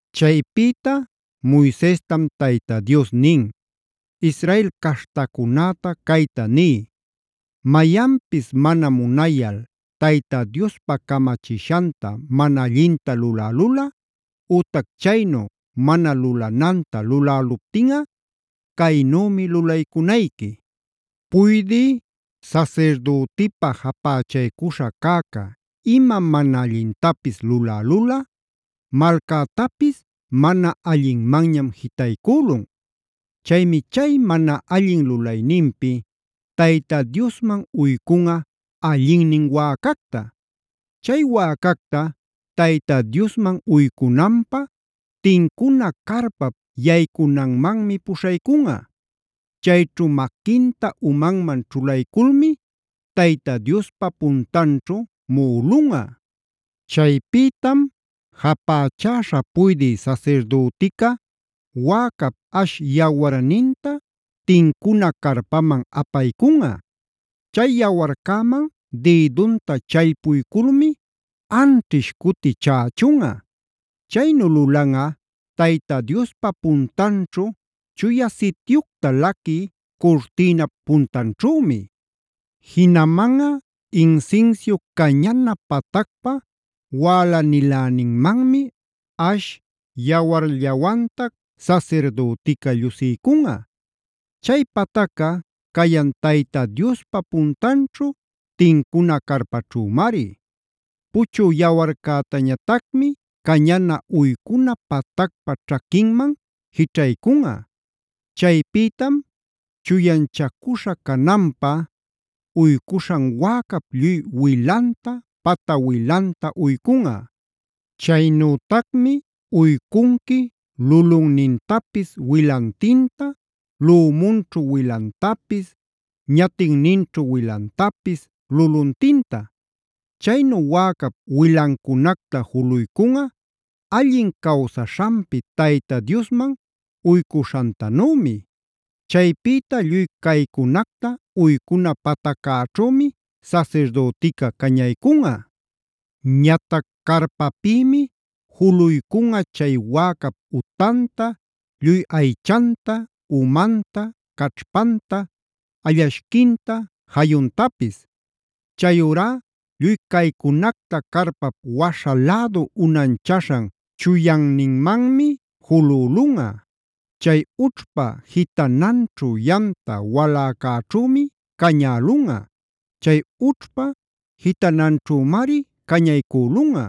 Chaypïta Moisestam Tayta Dios nin: “Israel caśhtacunäta cayta niy: Mayanpis mana munayal Tayta Diospa camachishanta mana allinta lulälulꞌa, ütac chaynu mana lulananta luläluptinꞌa caynümi lulaycunayqui. “Puydï sasirdütipa japächaycuśha cäca ima mana allintapis lulälulꞌa malcätapis mana allinmanñam jitaycülun. Chaymi chay mana allin lulayninpi Tayta Diosman uycunꞌa allinnin wäcacta. Chay wäcacta Tayta Diosman uycunanpä tincuna carpap yaycunanmanmi puśhaycunꞌa. Chayćhu maquinta umanman ćhulayculmi Tayta Diospa puntanćhu muꞌulunꞌa. Chaypïtam japächäśha puydï sasirdütica wäcap ash yawarninta tincuna carpaman apaycunꞌa. Chay yawarcäman dïdunta challpuyculmi anchiśh cuti chächunꞌa. Chaynu lulanꞌa Tayta Diospa puntanćhu Chuya Sityucta laquï curtïnap puntanćhümi. Jinamanꞌa insinsiu cañana patacpa wälaniläninmanmi ash yawarllawantac sasirdütica llusiycunꞌa. Chay patacca cayan Tayta Diospa puntanćhu, tincuna carpaćhümari. Puchü yawarcätañatacmi cañana uycuna patacpa ćhaquinman jićhaycunꞌa. Chaypïtam chuyanchacuśha cananpä uycuśhan wäcap lluy wilanta, pata wilanta uycunꞌa. Chaynütacmi uycunqui lulunnintapis wilantinta, lümunćhu wilantapis, ñatinninćhu wilantapis, luluntinta. Chaynu wäcap wilancunacta juluycunꞌa allin cawsaśhanpi Tayta Diosman uycuśhantanümi. Chaypïta lluy caycunacta uycuna pataccäćhümi sasirdütica cañaycunꞌa. Ñatac carpapïmi juluycunꞌa chay wäcap utanta, lluy aychanta, umanta, caćhpanta, allashquinta, jayuntapis. Chayurá lluy caycunacta carpap waśha lädu unanchaśhan chuyanninmanmi julülunꞌa; chay ućhpa jitananćhu yamta waläcäćhümi cañälunꞌa. Chay ućhpa jitananćhümari cañaycülunꞌa.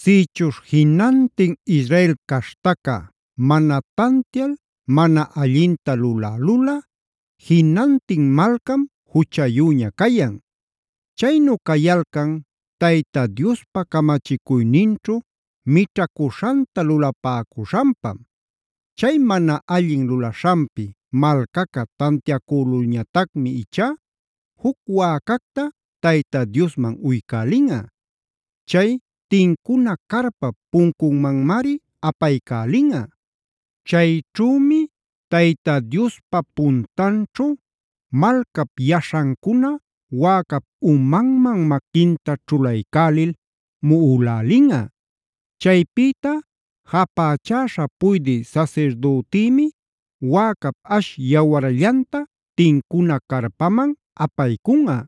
“Sïchuśh jinantin Israel caśhtaca mana tantial mana allinta lulälulꞌa, jinantin malcam juchayüña cayan. Chaynu cayalcan Tayta Diospa camachicuyninćhu mićhacuśhanta lulapäcuśhanpam. Chay mana allin lulaśhanpi malcaca tantiacülulñatacmi ichá juc wäcacta Tayta Diosman uycälinꞌa. Chay tincuna carpap puncunmanmari apaycälinꞌa. Chayćhümi Tayta Diospa puntanćhu malcap yaśhancuna wäcap umanman maquinta ćhulaycälil muꞌulälinꞌa. Chaypïta japächäśha puydï sasirdütïmi wäcap ash yawarllanta tincuna carpaman apaycunꞌa.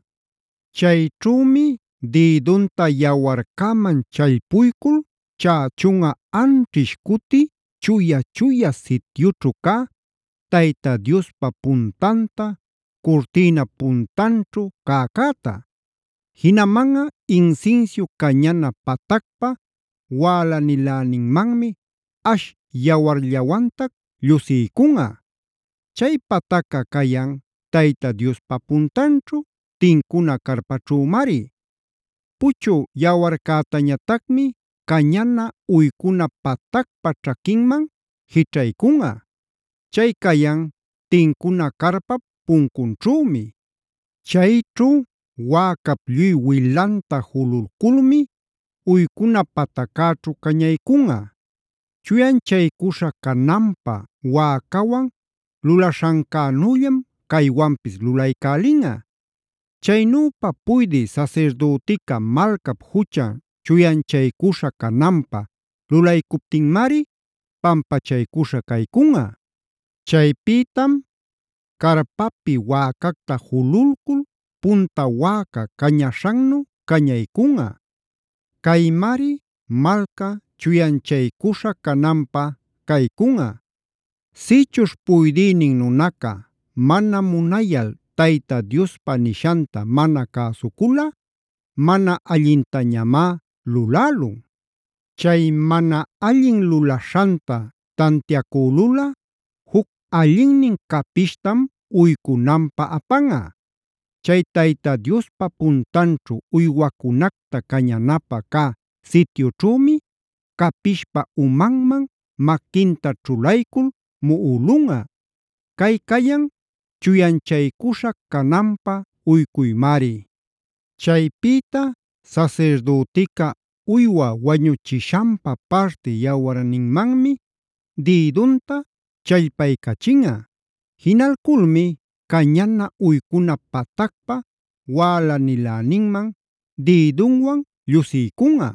Chayćhümi dïdunta yawarcäman challpuycul chächunꞌa anćhish cuti chuya-chuya sityućhu cä Tayta Diospa puntanta, curtïnap puntanćhu cäcäta. Jinamanꞌa insinsiu cañana patacpa wälaniläninmanmi ash yawarllawantac llusiycunꞌa. Chay patacca cayan Tayta Diospa puntanćhu, tincuna carpaćhümari. Puchü yawarcätañatacmi cañana uycuna patacpa ćhaquinman jićhaycunꞌa. Chay cayan tincuna carpap puncunćhümi. Chayćhu wäcap lluy wilanta jululculmi uycuna pataccäćhu cañaycunꞌa. Chuyanchaycuśha cananpä wäcawan lulaśhancänüllam caywanpis lulaycälinꞌa. Chaynüpa puydï sasirdütica malcap juchan chuyanchaycuśha cananpä lulaycuptinmari pampachaycuśha caycunꞌa. Chaypïtam carpapi wäcacta jululcul punta wäca cañaśhannu cañaycunꞌa. Caymari malca chuyanchaycuśha cananpä caycunꞌa. “Sïchuśh puydïnin nunaca mana munayal Tayta Diospa nishanta mana cäsuculꞌa mana allintañamá lulälun. Chay mana allin lulaśhanta tantiacülulꞌa juc allinnin capishtam uycunanpä apanꞌa. Chay Tayta Diospa puntanćhu, uywacunacta cañanapä cä sityućhümi capishpa umanman maquinta ćhulaycul muꞌulunꞌa. Cay cayan chuyanchaycuśha cananpä uycuymari. Chaypïta sasirdütica uywa wañuchishanpa parti yawarninmanmi dïdunta challpaycachinꞌa. Jinalculmi cañana uycuna patacpa wälaniläninman dïdunwan llusiycunꞌa.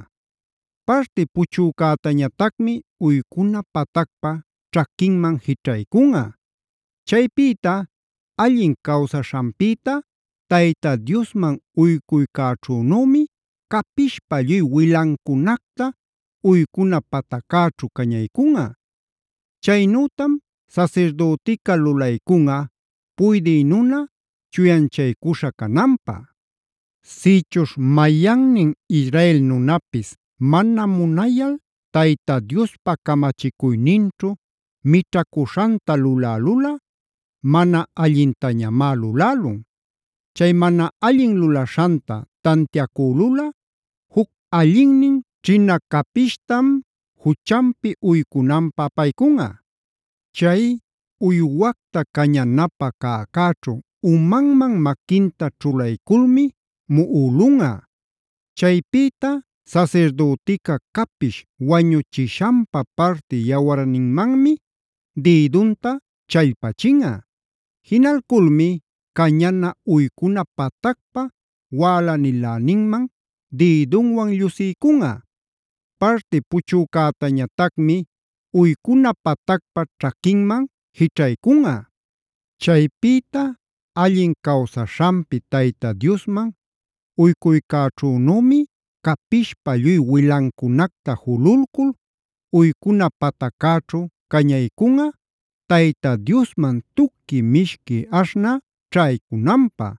Parti puchücätañatacmi uycuna patacpa ćhaquinman jićhaycunꞌa. Chaypïta allin cawsaśhanpïta Tayta Diosman uycuycäćhünümi capishpa lluy wilancunacta uycuna pataccäćhu cañaycunꞌa. Chaynütam sasirdütica lulaycunꞌa puydï nuna chuyanchaycuśha cananpä. “Sïchuśh mayannin Israel nunapis mana munayal Tayta Diospa camachicuyninćhu mićhacuśhanta lulälulꞌa mana allintañamá lulälun. Chay mana allin lulaśhanta tantiacülulꞌa juc allinnin ćhina capishtam juchanpi uycunanpä apaycunꞌa. Chay uywacta cañanapä cäcäćhu umanman maquinta ćhulayculmi muꞌulunꞌa. Chaypïta sasirdütica capish wañuchishanpa parti yawarninmanmi dïdunta challpachinꞌa. Jinalculmi cañana uycuna patacpa wälaniläninman dïdunwan llusiycunꞌa. Parti puchücätañatacmi uycuna patacpa ćhaquinman jićhaycunꞌa. Chaypïta allin cawsaśhanpi Tayta Diosman uycuycäćhünümi capishpa lluy wilancunacta jululcul uycuna pataccäćhu cañaycunꞌa, Tayta Diosman tuqui mishqui aśhnä ćhaycunanpä.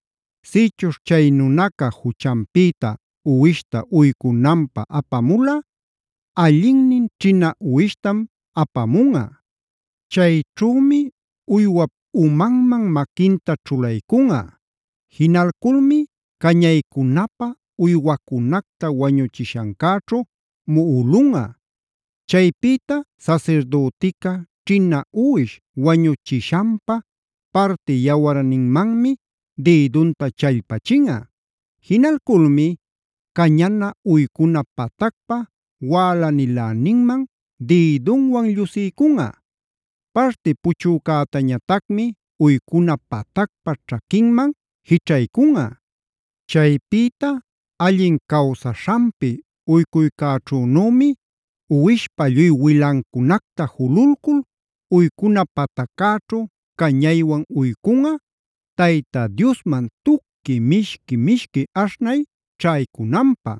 “Sïchuśh chay nunaca juchanpïta uwishta uycunanpä apamulꞌa allinnin ćhina uwishtam apamunꞌa. Chayćhümi uywap umanman maquinta ćhulaycunꞌa. Jinalculmi cañaycunapä uywacunacta wañuchishancäćhu muꞌulunꞌa. Chaypïta sasirdütica ćhina uwish wañuchishanpa parti yawarninmanmi dïdunta challpachinꞌa. Jinalculmi cañana uycuna patacpa wälaniläninman dïdunwan llusiycunꞌa. Parti puchücätañatacmi uycuna patacpa ćhaquinman jićhaycunꞌa. Chaypïta allin cawsaśhanpi uycuycäćhünümi uwishpa lluy wilancunacta jululcul uycuna pataccäćhu cañaywan uycunꞌa, Tayta Diosman tuqui mishqui-mishqui aśhnay ćhaycunanpä.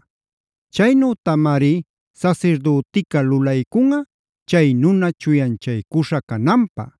Chaynütamari sasirdütica lulaycunꞌa chay nuna chuyanchaycuśha cananpä.